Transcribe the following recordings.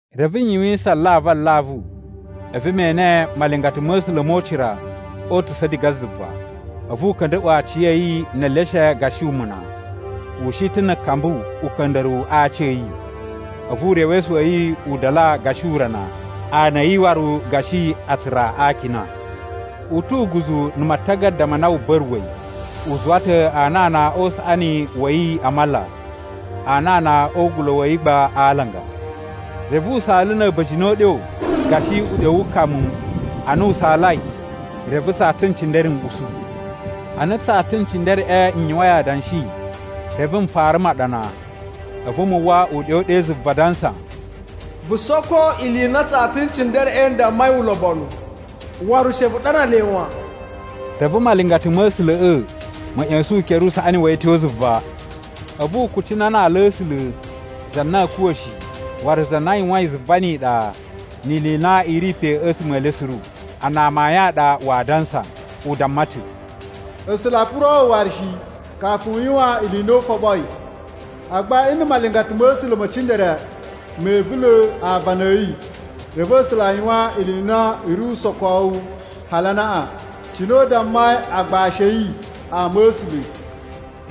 Reve n yuwisan alavu alavu, a̱vu me ene malingata ma̱ A̱sula̱ mo ucira o utusa̱ diga zuva. A̱vu u ka̱nda̱ꞌwa̱ aciya̱yi ne eleshe gashi umuna, u shi ta̱ na̱ kambu uka̱nda̱ruwu a aaci a̱ yi. A̱vu urewesu wa̱ yi u dala gashi urana, ana a̱ yi waru gashi atsura a akina. U tu uguzu na̱ matagada ma na wu ba̱ruwa̱i. U zuwa ta̱ anana o usaꞌani wa̱ yi a mala, anana o ugula̱ wa̱ yi gba a alanga. Reve u saala na̱ a̱ba̱jini o uɗyo gashi uɗyo wu kamu. Ana u saalai, reve tsata n cindere n usu. Ana tsata n cindereꞌe n yuwain adanshi, reve n fara maɗana. A̱vu mu uwwa uɗyo ɗe zuva adansa, “Vu soko ili i na tsata n cindereꞌe n dammai ulobonu, waru she vu ɗana le wan.” Reve malingata ma̱ A̱sula̱ꞌa̱ ma̱ ꞌya̱sa̱n ukere usaꞌani wa̱ yi a̱ tyo zuva. A̱vu u kucina na ala a̱ A̱sula̱, za na a̱a̱ kuwa̱ shi, waru za na yuwain zuva ni iɗa ni ili i na i ri pe a̱tsuma̱ e le suru, a na amayun a ɗa waa dansa. U damma ta̱, “A̱sula̱ oo puro waru shi, kafu u yuwan ili i na u foɓoi. Agba nna̱ malingata ma̱ A̱sula̱ me cindere me ivula̱ aavana a̱ yi, reve A̱sula̱ a yuwan ili i na i ri usokowu hali anaꞌan, cine u dammai agbashi a̱ yi, ama̱sula̱.”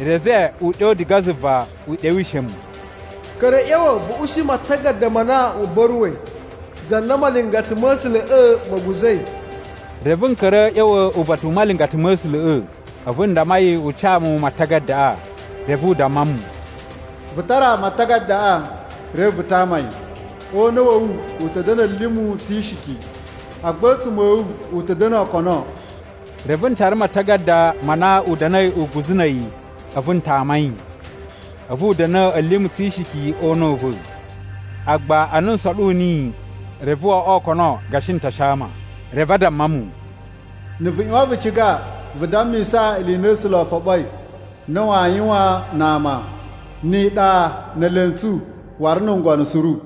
Reve uɗyo diga zuva u ɗewishe mu: “Ka̱ra̱ a̱ ꞌya̱wa̱ vu ushi matagada ma na wu ba̱ruwa̱i, za na malingata ma̱ A̱sula̱ꞌa̱ ma̱ guza̱i.” Reve n ka̱ra̱ a̱ ꞌya̱wa̱ uba̱ta̱ u malingata ma̱ A̱sula̱ꞌa̱, a̱vu n damma yi u ca mu matagadaꞌa. Reve u damma mu, “Vu tara matagadaꞌa reve vu tama yi. O una̱ wa̱ wu u ta̱ da̱na̱ a̱limu tsi ishiki, agba a̱ a̱a̱tsuma̱ a̱ wu u ta̱ da̱na̱ okono.” Reve n tara matagada ma na u da̱na̱i uguzu na̱ a̱yi a̱vu n tama yi. A̱vu u da̱na̱ a̱limu tsi ishiki o una̱ u va̱, agba ana n soɗu niyi, reve wo oꞌwo okono gashi n ta shaama. Reve a damma mu, “Na̱ vu ꞌyuwan vu ciga vu dammisa ili i na A̱sula̱ o foɓoi na waa yuwan na ama, ni iɗa, ne elentsu, waru na̱ ngono suru.”